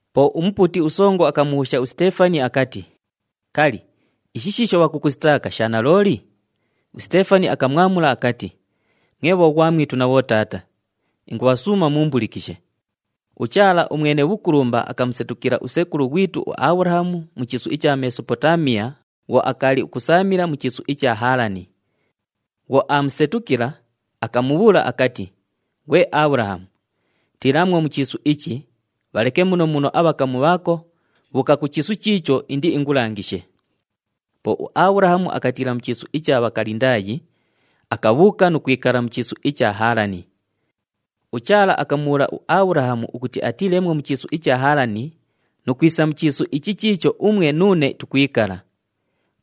Po umupuuti usongo akamubhuusha uSiteefani akati, “Kali, ishi shiisho bhakukusitaaka sha nalooli?” USiteefani akabhaamula akati, “Mwe bhoghwamwitu na bhotaata, ingubhasuuma muumbulikishe. UChaala uMwene Bhukulumba akamusetukila usekulu ghwitu uAbhulahamu mu chiisu icha Mesopotaamiya bhwo akaali ukusaamila mu chiisu icha Haalani. Bhwo aamusetukila, akamubhuula akati, ‘Ghwe Abhulahamu, tiilaamwo mu chiisu ichi, bhaleke muno muno abhakamu bhaako, bhuuka ku chiisu chiicho indiingulangishe.’ Po uAbhulahamu akatiila mu chiisu icha Bhakalindaayi, akabhuuka nu kwikala mu chiisu icha Haalani. UChaala akamubhuula uAbhulahamu ukuti atiileemwo mu chiisu icha Haalani nu kwisa mu chiisu ichi chiicho umwe nuune tukwikala.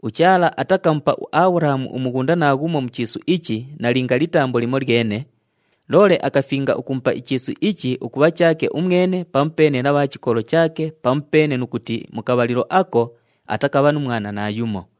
UChaala atakamupa uAbhulahamu umughunda naaghumo mu chiisu ichi nalinga litambo limolyene, loole akafinga ukumupa ichiisu ichi ukubha chaake umwene pamupeene na bha chikolo chaake pamupeene nu kuti mu kabhalilo ako atakabha nu mwana naayumo.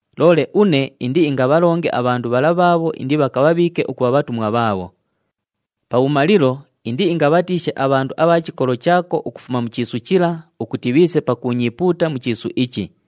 Loole une indiingabhalonge abhandu bhala bhaabho indibhakabhabhiike ukubha bhatumwa bhaabho. Pabhumalilo, indiingabhatiishe abhandu abha mu chikolo chaako ukufuma mu chiisu chila ukuti bhiise pakuunyiipuuta mu chiisu ichi.’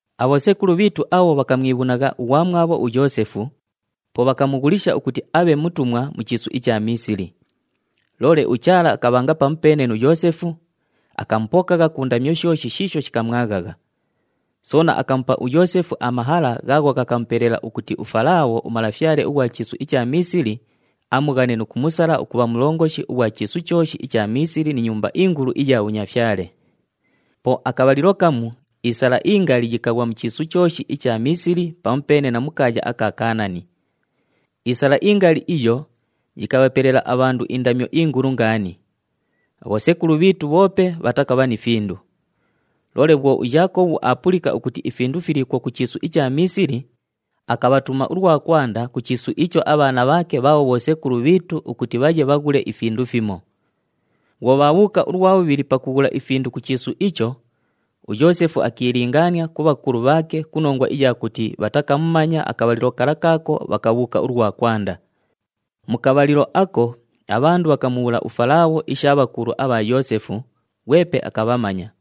“Abhosekulu bhiitu abho bhakamwibhunagha ughwamwabho uYoosefu, po bhakamughulisha ukuti abhe mutumwa mu chiisu icha Miisili. Loole uChaala akabhanga pamupeene nu Yoosefu, akamupokagha ku ndamyo shooshi shiisho shikamwaghagha. Soona akamupa uYoosefu amahala ghaagho ghakamupelela, ukuti uFalaabho umalafyale ughwa chiisu icha Miisili amughane, nu kumusala ukubha mulongoshi ughwa chiisu chooshi icha Miisili ni nyumba ingulu iya bhunyafyale. Po akabhalilo kamu isala ingali yikaghwa mu chiisu chooshi icha Miisili pamupeene na mu kaaya aka Kaanani. Isala ingali iyo yikabhapelela abhandu indamyo ingulu ngaani. Abhosekulu bhiitu bhoope bhatakabha ni findu. Loole bhwo uYaakobhu aapulika ukuti ifindu filiikwo ku chiisu icha Miisili, akabhatuma ulwa kwanda ku chiisu icho abhaana bhaake bhaabho bhosekulu bhiitu ukuti bhaye bhaghule ifindu fimo. Bhwo bhaabhuuka ulwa bhubhili pakughula ifindu ku chiisu icho, uYoosefu akiilingaania ku bhakulu bhaake ku nongwa iya kuti bhatakamumanya akabhalilo kala kaako bhakabhuuka ulwa kwanda. Mu kabhalilo ako abhandu bhakamubhuula uFalaabho isha bhakulu abha Yoosefu, ghwepe akabhamanya.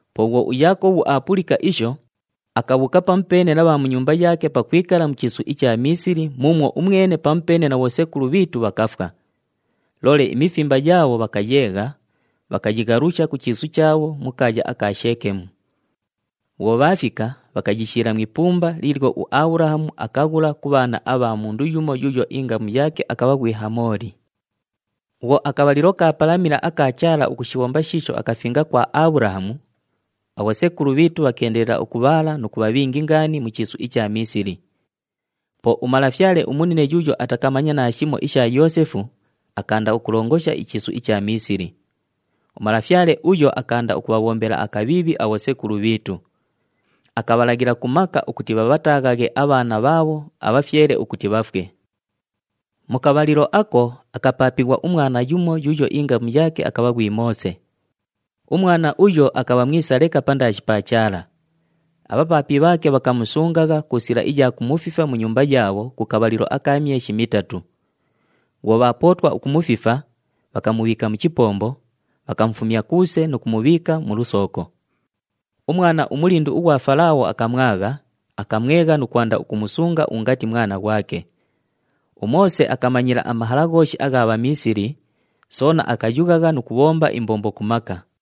Po bhwo uYaakobhu aapulika isho, akabhuuka pamupeene na bha mu nyumba yaake pakwikala mu chiisu icha Miisili muumwo umwene pamupeene na bhosekulu bhiitu bhakafwa. Loole imifimba yaabho bhakayeegha, bhakayighalusha ku chiisu chaabho mu kaaya aka Sheekemu. Bhwo bhaafika, bhakayishiila mu ipumba liilyo uAbhulahamu akaghula ku bhaana abha mundu yumo yuuyo ingamu yaake akabha ghwi Hamooli. “Bhwo akabhalilo kaapalamila aka Chaala ukushibhomba shiisho akafinga kwa Abhulahamu, abhosekulu bhiitu bhakeendelela ukubhaala nu kubha bhingi ngaani mu chiisu icha Miisili. Po umalafyale umunine yuuyo atakamanya naashimo isha Yoosefu, akaanda ukulongosha ichiisu icha Miisili. Umalafyale uyo akaanda ukubhabhombela akabhiibhi abhosekulu bhiitu. Akabhalaghila ku maka ukuti bhabhataaghaghe abhaana bhaabho abhafyele ukuti bhafwe. “Mu kabhalilo ako, akapaapighwa umwana yumo yuuyo ingamu yaake akabha ghwi Moose. Umwana uyo akabha mwisa leka pandaashi pa Chaala. Abhapaapi bhaake bhakamusungagha ku sila iya kumufifa mu nyumba yaabho ku kabhalilo aka myeshi mitatu. Bhwo bhaapootwa ukumufifa, bhakamubhiika mu chipombo, bhakamufumya kuuse nu kumubhiika mu lusooko. Umwana umulindu ughwa Falaabho akamwagha, akamwegha nu kwanda ukumusunga ungati mwana ghwake. UMoose akamanyila amahala ghooshi agha Bhamiisili, soona akayughagha nu kubhomba imbombo ku maka.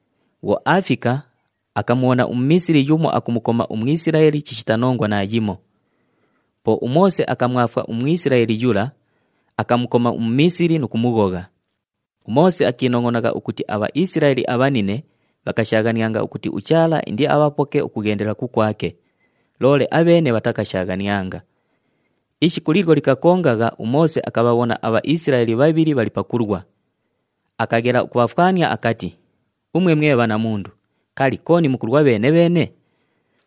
Bhwo aafika, akamubhona uMumiisili yumo akumukoma uMwisilaeli chishita nongwa naayimo. Po uMoose akamwafwa uMwisilaeli yula, akamukoma uMumiisili nu kumughogha. UMoose akiinongʼonagha ukuti aBhaisilaeli abhanine bhakashaaghanianga ukuti uChaala indiabhapoke ukughendela kukwake, loole abheene bhatakashaaghanianga. Ishiku liilyo likakongagha, uMoose akabhabhona aBhaisilaeli bhabhili bhali pakulwa. Akaghela ukubhafwania akati, ‘Umwe mwe bhanamundu, kali, kooni mukulwa bheene-bheene?’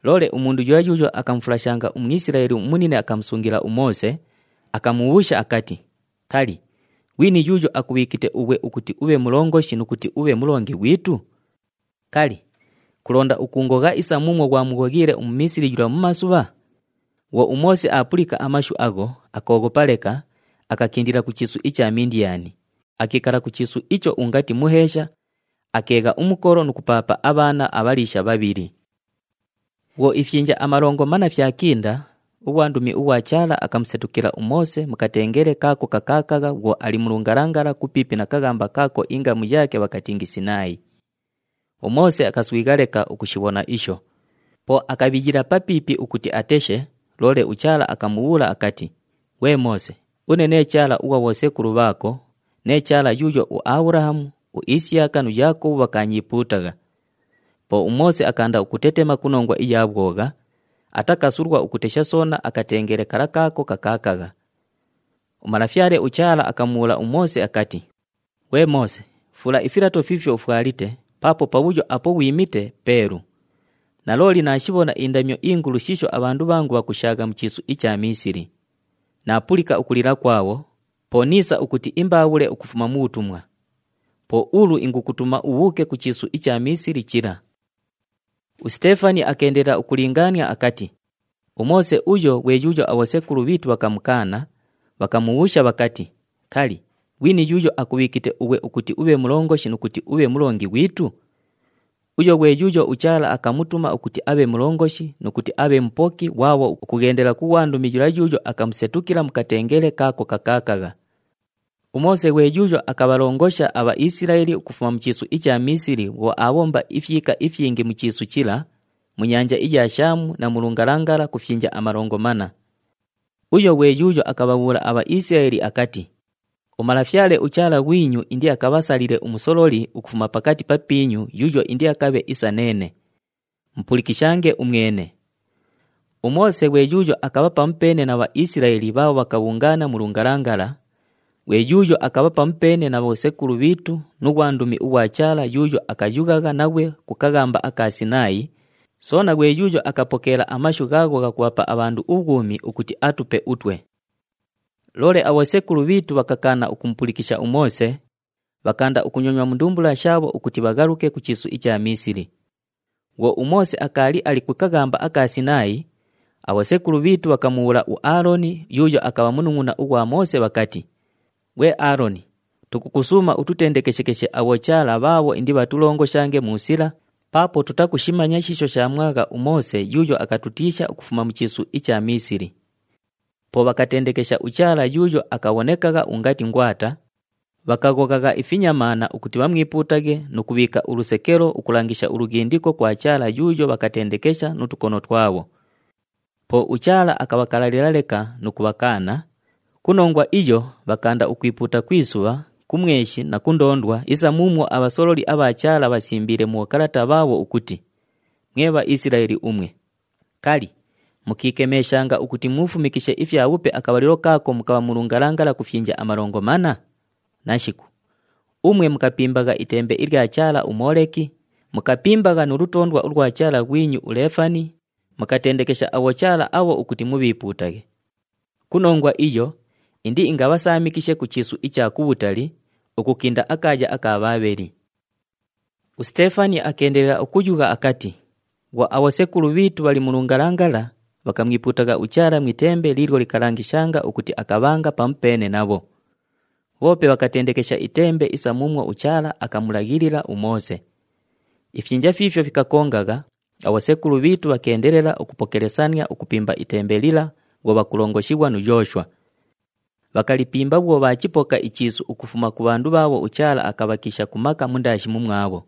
Loole umundu yula yuuyo akamufulashanga uMwisilaeli umunine akamusungila uMoose, akamubhuusha akati, ‘Kali, ghwini yuuyo akubhiikite ughwe ukuti ubhe mulongoshi nu kuti ubhe mulongi ghwitu? Kali, kulonda ukuungogha isa muumwo ghwamughoghiile uMumiisili yula mumasubha?’ Bhwo uMoose aapulika amashu agho, akooghopa leka, akakindila ku chiisu icha Mindiyani, akiikala ku chiisu icho ungati muheesha, akeegha umukolo nu kupaapa abhaana abhaliisha bhabhili. “Bhwo ifyinja amalongo manna fyakinda, ughwandumi ughwa Chaala akamusetukila uMoose mu katengele kaako kakaakagha bhwo ali mu lungalangala, kupiipi na kaghamba kaako ingamu yaake bhakatingi Sinaayi. UMoose akaswigha leka ukushibhona isho. Po akabhiyila papiipi ukuti ateshe, loole uChaala akamubhuula akati, ‘Ghwe Moose, une nee Chaala ughwa bhosekulu bhaako, nee Chaala yuuyo uAbhulahamu, uIsiyaka nu Yaakobhu bhakaanyiipuutagha!’ Po uMoose akaanda ukutetema ku nongwa iya bhwogha, atakasulwa ukukatesha soona akatengele kala kaako kakaakagha. UMalafyale uChaala akamubhuula uMoose akati, ‘Ghwe Moose, fuula ifilato fiifyo ufwalite paapo pabhuyo apo ghwimite peelu. Nalooli naashibhona indamyo ingulu shiisho abhandu bhangu bhakushaagha mu chiisu icha Miisili. Naapulika ukulila kwabho, po niisa ukuti imbaabhule ukufuma mu bhutumwa. Po ulu ingukutuma ubhuuke ku chiisu icha Miisili chila.’” USiteefani akeendelela ukulingaania akati, “UMoose uyo ghwe yuuyo abhosekulu bhiitu bhakamukaana, bhakamubhuusha bhakati, ‘Kali, ghwini yuuyo akubhiikite ughwe ukuti ubhe mulongoshi nu kuti ubhe mulongi ghwitu?’ Uyo ghwe yuuyo uChaala akamutuma ukuti abhe mulongoshi, nu kuti abhe mupoki ghwabho, ukughendela ku ghwandumi yula yuuyo akamusetukila mu katengele kaako kakaakagha. UMoose ghwe yuuyo akabhalongosha aBhaisilaeli ukufuma mu chiisu icha Miisili bhwo aabhomba ifyika ifyingi mu chiisu chila, mu nyanja iya Shaamu na mu lungalangala ku fyinja amalongo manna. Uyo ghwe yuuyo akabhabhuula aBhaisilaeli akati, ‘UMalafyale uChaala ghwinyu indiakabhasalile umusololi ukufuma pakati papiinyu yuuyo indiakabhe isa neene. [Mupulikishange umwene.]’ UMoose ghwe yuuyo akabha pamupeene na Bhaisilaeli bhaabho bhakabhungaana mu lungalangala, ghwe yuuyo akabha pamupeene na bhosekulu bhiitu nu ghwandumi ughwa Chaala yuuyo akayughagha naghwe ku kaghamba aka Sinaayi, soona ghwe yuuyo akapokeela amashu ghaagho ghakubhapa abhandu ubhwumi ukuti atupe utwe. “Loole abhosekulu bhiitu bhakakaana ukumupulikisha uMoose, bhakaanda ukunyonywa mu ndumbula shaabho ukuti bhaghaluke ku chiisu icha Miisili. Bhwo uMoose akaali ali ku kaghamba aka Sinaayi, abhosekulu bhiitu bhakamubhuula uAaloni yuuyo akabha munungʼuna ughwa Moose bhakati, ‘Ghwe Aaloni, tukusuuma ututendekeshekeshe abhochaala bhaabho indibhatulongoshange mu sila paapo tutakushimanya shiisho shaamwagha uMoose yuuyo akatutiisha ukufuma mu chiisu icha Miisili!’ Po bhakatendekesha uchaala yuuyo akabhonekagha ungati ngwata, bhakaghoghagha ifinyamaana ukuti bhamwipuutaghe nu kubhiika ulusekelo ukulangisha ulughindiko kwa chaala yuuyo bhakatendekesha nu tukono twabho. Po uChaala akabhakalalila leka nu kubhakaana, ku nongwa iyo bhakaanda ukwipuuta ku isubha, ku mweshi na ku ndoondwa isa muumwo abhasololi abha Chaala bhasimbiile mu bhokalata bhaabho ukuti, ‘Mwe Bhaisilaeli umwe, kali, mukiikemeeshanga ukuti muufumishikishe ifyabhupe akabhalilo kaako mukabha mu lungalangala ku fyinja amalongo manna? Nashiku! Umwe mukapimbagha itembe ilya chaala uMooleki, mukapimbagha nu lutoondwa ulwa chaala ghwinyu uLeefani, mukatendekesha abhochaala abho ukuti mubhiipuutaghe. Ku nongwa iyo, indiingabhasaamikishe ku chiisu icha kubhutali, ukukinda akaaya aka Bhaabheli!’” USiteefani akeendelela ukuyugha akati, “Bhwo abhosekulu bhiitu bhali mu lungalangala, bhakamwipuutagha uChaala mu itembe liilyo likalangishanga ukuti akabhanga pamupeene nabho. Bhoope bhakatendekesha itembe isa muumwo uChaala akamulaghilila uMoose. Ifyinja fiifyo fikakongagha, abhosekulu bhiitu bhakeendelela ukupokelesania ukupimba itembe lila bhwo bhakulongoshighwa nu Yooshwa. Bhakalipimba bhwo bhaachipoka ichiisu ukufuma ku bhandu bhaabho uChaala akabhakiisha ku maka mundaashi mumwabho.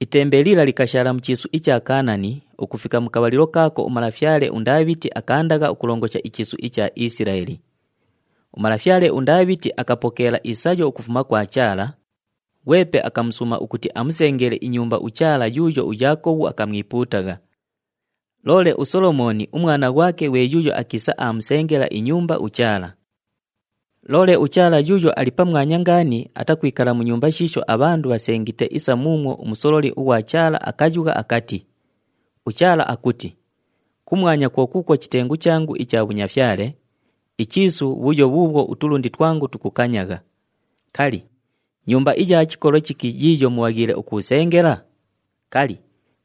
Itembe lila likashaala mu chiisu icha Kaanani ukufika mu kabhalilo kaako umalafyale uNdaabhiti akaandagha ukulongosha ichiisu icha Isilaeli. Umalafyale uNdaabhiti akapokeela isayo ukufuma kwa Chaala, ghwepe akamusuuma ukuti amusengele inyumba uChaala yuuyo uYaakobhu akamwipuutagha. Loole uSolomooni umwana ghwake ghwe yuuyo akiisa aamusengela inyumba uChaala. “Loole uChaala Yuuyo Ali Pamwanya Ngaani atakwikala mu nyumba shiisho abhandu bhasengite isa muumwo umusololi ughwa Chaala akayugha akati, ‘UChaala akuti, “Kumwanya kwo kuukwo chitengu changu icha bhunyafyale, ichiisu bhuyo bhuubhwo utulundi twangu tukukanyagha. Kali, nyumba iya chikolo chiki yiiyo mubhaghiile ukuusengela? Kali,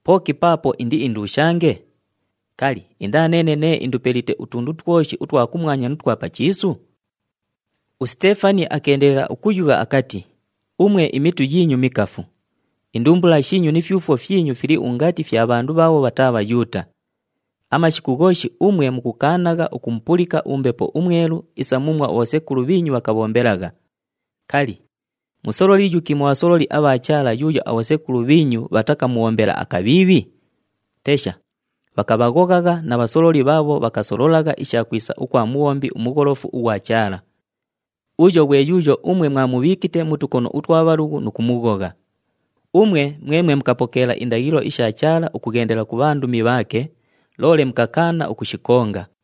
pooki paapo indiindushange? Kali, indaa neene nee indupelite utundu twoshi utwa kumwanya nu twa pa chiisu?”’” USiteefani akeendelela ukuyugha akati, “Umwe imitu yiinyu mikafu! Indumbula shiinyu ni fyufwo fyinyu fili ungati fya bhandu bhaabho bhataa Bhayuuta. Amashiku ghooshi umwe mukukaanagha ukumupulika uMbepo uMwelu isa muumwo abhosekulu bhiinyu bhakabhombelagha. Kali, musololi yuki mu bhasololi abha Chaala yuuyo abhosekulu bhiinyu bhatakamubhombela akabhiibhi? Tesha, bhakabhaghoghagha na bhasololi bhaabho bhakasololagha isha kwisa ukwa Mubhombi uMugholofu ughwa Chaala. Uyo ghwe yuuyo umwe mwamubhiikite mu tukono utwa bhalughu nu kumughogha! Umwe, mwemwe mukapokeela indaghilo isha Chaala ukughendela ku bhandumi bhaake, loole mukakaana ukushikonga.”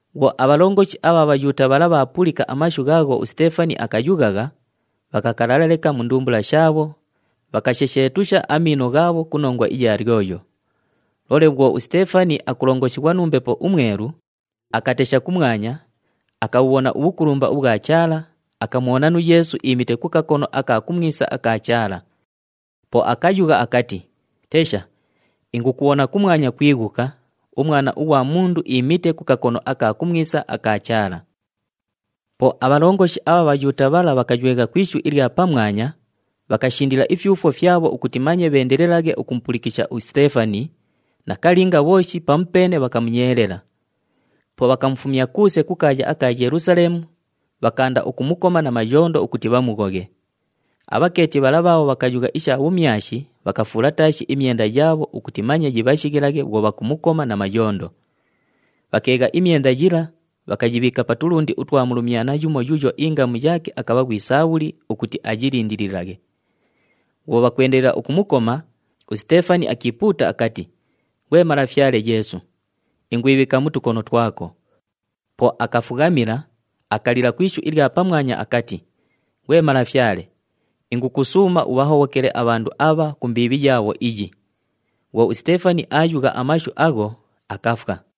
Bhwo abhalongoshi abha Bhayuuta bhala bhaapulika amashu ghaagho uSiteefani akayughagha, bhakakalala leka mu ndumbula shaabho, bhakashesheetusha amiino ghaabho ku nongwa iya lyoyo. Loole bhwo uSiteefani akulongoshighwa nu Mbepo uMwelu, akatesha kumwanya, akabhubhona ubhukulumba ubhwa Chaala, akamubhona nu Yeesu iimite ku kakono aka kumwisa aka Chaala. Po akayugha akati, “Tesha, ingukubhona kumwanya kwighuka, uMwana ughwa Mundu iimite ku kakono aka kumwisa aka Chaala!” Po abhalongoshi abha Bhayuuta bhala bhakaywegha ku ishu ilya pamwanya, bhakashindila ifyufwo fyabho ukuti manye bheendelelaghe ukumupulikisha uSiteefani, nakalinga bhooshi pamupeene bhakamunyeelela. Po bhakamufumya kuuse ku kaaya aka Yelusaleemu, bhakaanda ukumukoma na mayondo ukuti bhamughoghe. Abhakeeti bhala bhaabho bhakayugha isha bhumyashi bhakafuula taashi imyenda yaabho ukuti manye yibhashighilaghe bhwo bhakumukoma na mayondo. Bhakeegha imyenda yila, bhakayibhiika pa tulundi utwa mulumyana yumo yuuyo ingamu yaake akabha ghwi Saabhuli ukuti ayilindililaghe. Bhwo bhakwendelela ukumukoma, uSiteefani akiipuuta akati, “Ghwe Malafyale Yeesu, ingwibhiika mu tukono twako.” Po akafughamila, akalila ku ishu ilya pamwanya akati, “Ghwe Malafyale, ingukusuuma ubhahobhokele abhandu abha ku mbiibhi yaabho iyi.” Bhwo uSiteefani aayugha amashu agho, akafwa.